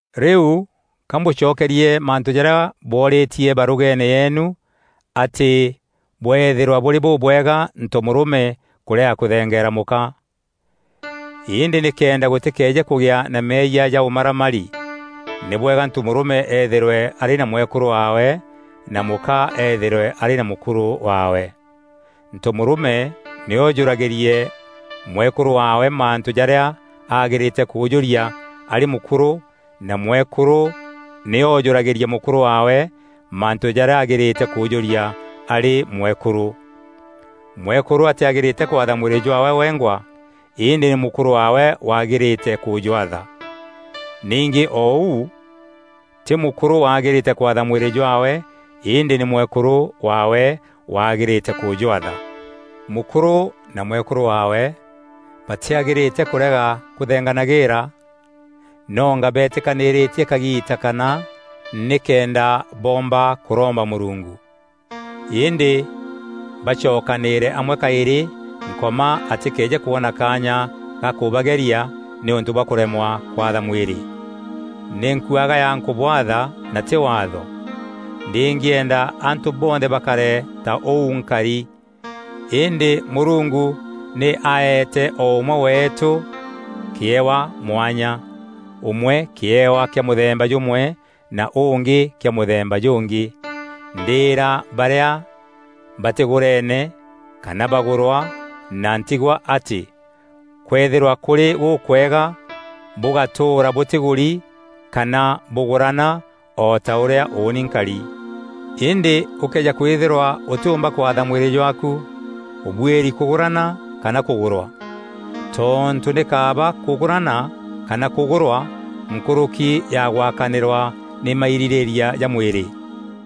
Rîu ka mbûcokerie mantû jarîa bwoorîtie barûgeene yeenu atî bweethîrwa bûrî bûbwega ntomûrûme kûrega kûthengeera mûka. Îndî nîkenda gûtîkeeje kûgîa na meeyia ja ûmaramari, nî bwega ntomûrûme ethîrwe arî na mwekûrû waawe na mûka ethîrwe arî na mûkûrû waawe. Ntomûrûme nî oojûragîrie mwekûrû waawe mantû jarîa agîrîte kûjûria arî mûkûrû na mwekûrû nî oojûragîrie mûkûrû waawe mantû jarîa agîrîte kûjûria arî mwekûrû. Mwekûrû atîagîrîte kwatha mwîrî jwaawe wengwa îndî nî mûkûrû waawe wagîrîte kûjwatha. Ningî o ûu tî mûkûrû wagîrîte kwatha mwîrî jwaawe îndî nî mwekûrû waawe wagîrîte kûjwatha. Mûkûrû na mwekûrû waawe batîagîrîte kûrega kûthenganagîîra, nonga beetîkanîîrîtie kagiita kana nîkenda boomba kûromba Mûrungu. Îndî bacokanîîre amwe kaîrî Nkoma atîkeeje kwona kaanya ga kûbageria nîûntû bwa kûremwa kwatha mwîrî. Nî nkuagaya nkûbwatha na tî waatho. Ndîngîenda antû bonthe bakare ta ûu nkari. Îndî Mûrungu nî aete o ûmwe weetû kîewa mwanya. Ûmwe kîewa kîa mûthemba jûmwe na ûngî kîa mûthemba jûngî. Ndîîra barîa batîgûreene kana bagûrwa na ntigwa atî kwethîrwa kûrî gûkwega bûgatûûra batîgûrî kana bûgûrana o ta ûrîa ûûni nkari. Îndî ûkëeja kwîthîrwa ûtîûmba kwatha mwîrî jwaaku, ûbuîri kûgûrana kana kûgûrwa. Tontû nî kaaba kûgûrana kana kûgûrwa nkûrûki ya gwakanîrwa nî mairîrîîria ja mwîrî.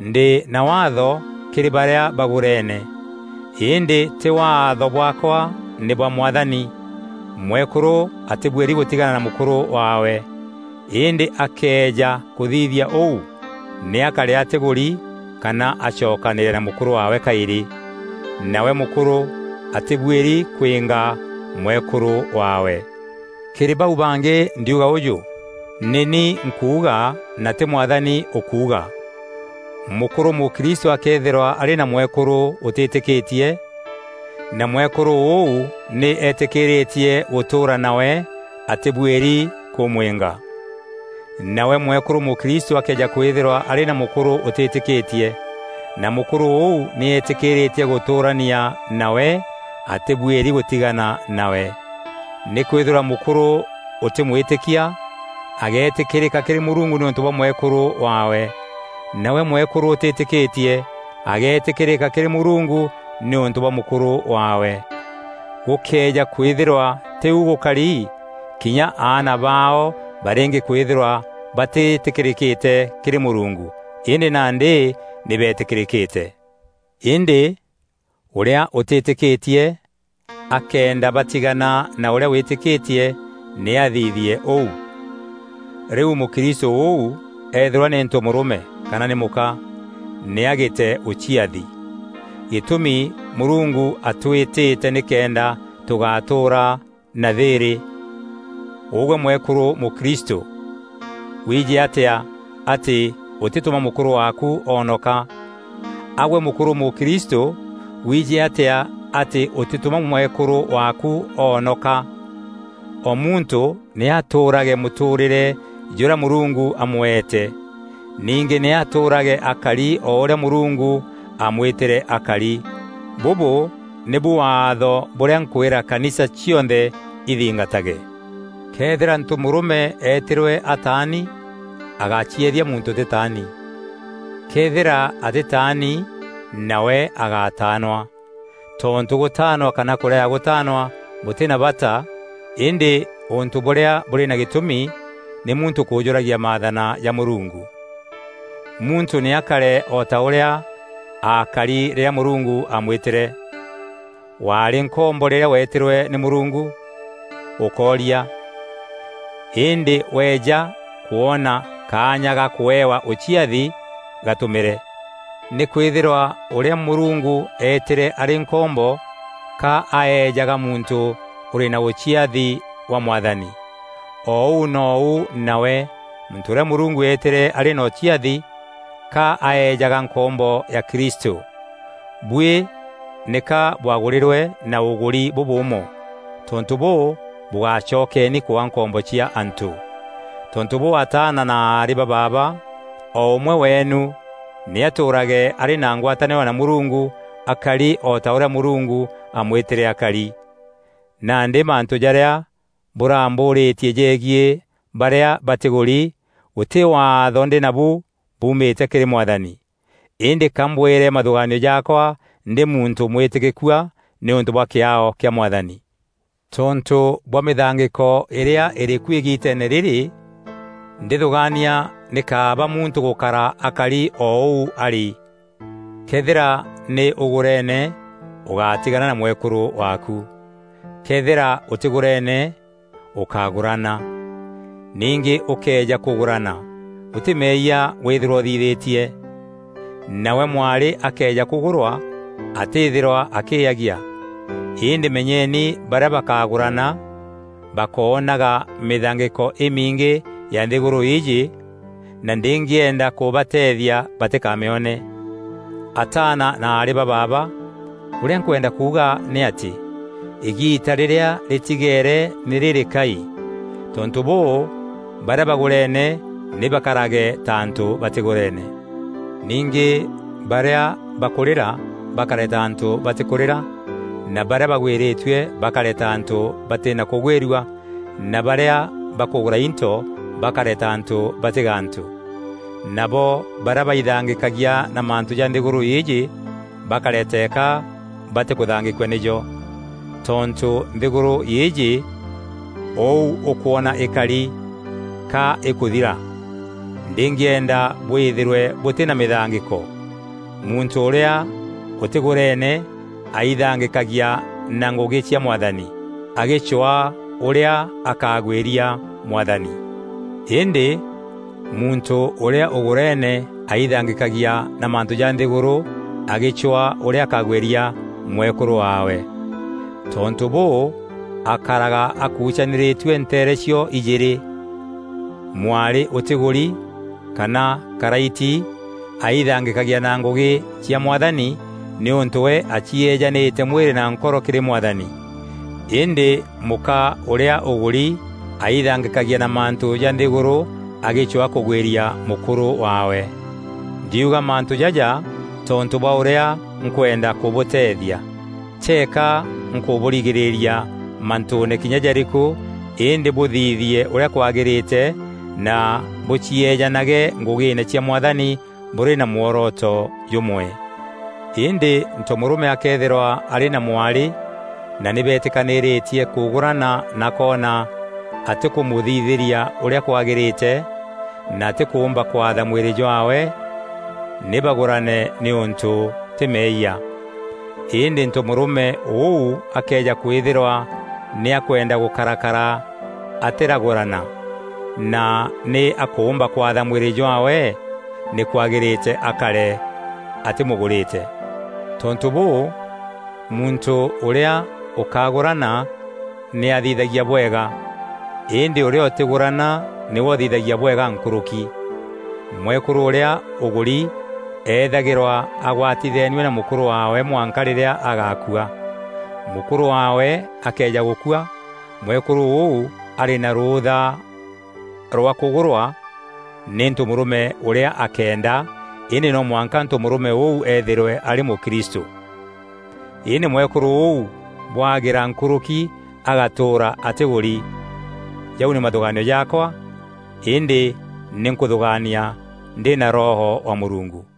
Ndî na Waatho kîrî barîa bagûreene, îndî tî waatho bwaakwa nî bwa Mwathani. Mwekûrû atîbuîri gûtigana na mûkûrû waawe. Îndî akëeja kûthithia ûu, nî akare atîgûri kana acokanîîre na mûkûrû waawe kaîrî. Nawe mûkûrû atîbuîri kwînga mwekûrû waawe. Kîrî bau bangî ndiuga ûjû: Nî ni nkuuga na tî Mwathani ûkuuga, mûkûrû mûkristû akëethîrwa arî na mwekûrû ûtîtîkîtie, na mwekûrû ûu nî eetîkîîrîtie gûtûûra nawe, atîbuîri kûmwînga. Nawe mwekûrû mûkristû akëeja kwîthîrwa arî na mûkûrû ûtîtîkîtie, na mûkûrû ûu nî eetîkîîrîtie gûtûûrania nawe, atîbuîri gûtigana nawe. Nîkwîthîrwa mûkûrû ûtî mwîtîkia ageetîkîrîka kîrî Mûrungu nîûntû bwa mwekûrû waawe. Nawe mwekûrû ûtîtîkîtie ageetîkîrîka kîrî Mûrungu nîûntû bwa mûkûrû waawe. Gûkëeja kwîthîrwa tî ûu gûkari, kinya aana baao barîngî kwîthîrwa batîtîkîrîkîte kîrî Mûrungu. Îndî nandî nî beetîkîrîkîte. Îndî ûrîa ûtîtîkîtie akenda batigana na ûrîa wîtîkîtie nî athithie ûu. Rîu mûkristû ûu eethîrwa nî ntomûrûme kana nî mûka, nî agîte ûciathi. Gîtûmi Mûrungu atwîtîte nîkenda tûgatûûra na thîîrî. Ûgwe mwekûrû mûkristû, wiijî atîa atî ûtîtûma mûkûrû waaku oonoka? A-gwe mûkûrû mûkristû, wiijî atîa atî ûtîtûma mwekûrû waaku oonoka? O muntû nî atûûrage mûtûûrîre jûrîa Mûrungu amweete. Ningî nî atûûrage akari o ûrîa Mûrungu aamwîtîre akari. Bûbû nîbu waatho bûrîa nkwîra kanisa cionthe ithingatage. Këethîra ntomûrûme eetîrwe ataani agácieethia muntû ûtîtaani. Këethîra atîtaani, nawe agátaanwa. Tontû gûtaanwa kana kûrega gûtaanwa bûtî na bata îndî ûntû bûrîa bûrî na gîtûmi nî muntû kûjûragia maathana ja Mûrungu. Muntû nî akare o ta ûrîa aakari rîrîa Mûrungu aamwîtîre. Waarî nkombo rîrîa wetîrwe nî Mûrungu? Ûkooria, îndî weja kwona kaanya ga kûewa ûciathi, gatumîre. Nîkwîthîrwa ûrîa Mûrungu eetîre arî nkombo ka aejaga muntû ûrî na ûciathi wa Mwathani. O ûu nou nawe muntû ûrîa Mûrungu eetîre arî na ûciathi, ka aejaga nkombo ya Kristû. Buî nîka bwagûrîrwe na ûgûri bûbûûmo, tontû bûû, bûgacokeeni kwaa nkombo cia antû. Tontû bûû ataana na aarî ba baaba, o ûmwe weenu nî atûûrage arî na ngwatanîro na Mûrungu akari o ta ûrîa Mûrungu aamwîtîre akari. Nandî mantû jarîa bûrambûûrîtie jegiî barîa batîgûrî, gûtî Waatho ndî nabu buumîte kîrî Mwathani. Îndî ka mbwîre mathûgaanio jaakwa ndî muntû mwîtîkîkua nîûntû bwa kîaao kîa Mwathani. Tontû bwa mîthangîko îrîa îrî ku îgiiteene rîrî, ndîthûgaania nî kaaba muntû gûkara akari o ûu arî. Këethîra nî ûgûrene, ûgátigana na mwekûrû waaku. Këethîra ûtîgûrene, ûkágûrana. Ningî ûkëeja kûgûrana, gûtî meeyia wîthîrwa ûthithîtie. Nawe mwarî akëeja kûgûrwa, atîîthîrwa akîîyagia. Îndî menyeni barîa bakagûrana, bakoonaga mîthangîko îmingî ya nthîgûrû îîjî na ndîngîenda kûbateethia batîkamîone. Ataana na aarî ba baaba, ûrîa nkwenda kuuga nî atî, îgiita rîrîa rîtigeere nî rîrîkai. Tontû bûû, barîa bagûrene nî bakarage ta antû batîgûrene. Ningî barîa bakûrîra bakare ta antû batîkûrîra na barîa bagwîrîtue bakare ta antû batî na kûgwîrua na barîa bakûgûra into bakare ta antû batî gantû. Nabo barîa baithangîkagia na mantû ja nthîgûrû îîjî bakare teeka batîkûthangîkua nîjo. Tontû nthîgûrû îîjî ûu ûkwona îkari, ka îkûthira. Ndîngîenda bwîthîrwe bûtî na mîthangîko. Muntû ûrîa ûtîgûrene aithangîkagia na ngûgî cia Mwathani, agîcwaa ûrîa akagwîria Mwathani. Îndî muntû ûrîa ûgûrene aithangîkagia na mantû ja nthîgûrû agîcwaa ûrîa akagwîria mwekûrû waawe. Tontû bûû, akaraga akucanîrîtue nteere cio-ijîîrî. Mwarî ûtîgûri kana karaiti aithangîkagia na ngûgî cia Mwathani nîûntû we acieejanîte mwîrî na nkoro kîrî Mwathani. Îndî mûka ûrîa ûgûri aithangîkagia na mantû ja nthîgûrû agîcwaa kûgwîria mûkûrû waawe. Ndiuga mantû jaja tontû bwa ûrîa nkwenda kûbûteethia. Teeka nkûbûrigîîria mantûûne kinya jarîkû îndî bûthithie ûrîa kwagîrîte na bûcieejanage ngûgîîne cia Mwathani bûrî na mworoto jûmwe. Îndî ntomûrûme akëethîrwa arî na mwarî na nî beetîkanîrîtie kûgûrana na akoona atîkûmûthithîria ûrîa kwagîrîte na atîkûmba kwatha mwîrî jwaawe, nî bagûrane nîûntû tî meeyia. Îndî ntomûrûme ûu akëeja kwîthîrwa nî akwenda gûkarakara atîragûrana na nî akûmba kwatha mwîrî jwaawe nî kwagîrîte akare atîmûgûrîte. Tontû bûû, muntû ûrîa ûkagûrana nî athithagia bwega, îndî ûrîa ûtîgûrana nîwe ûthithagia bwega nkûrûki. Mwekûrû ûrîa ûgûri eethagîrwa agwatitheenue na mûkûrû waawe mwanka rîrîa agakua. Mûkûrû waawe akëeja gûkua, mwekûrû ûu arî na rûûtha rwa kûgûrwa nî ntomûrûme ûrîa akeenda, îndî no mwanka ntomûrûme ûu eethîrwe arî mûkristû. Îndî mwekûrû ûu bwagîra nkûrûki agatûûra atîgûri. Jau nî mathûgaanio jaakwa îndî nî nkûthûgaania ndî na Roho wa Mûrungu.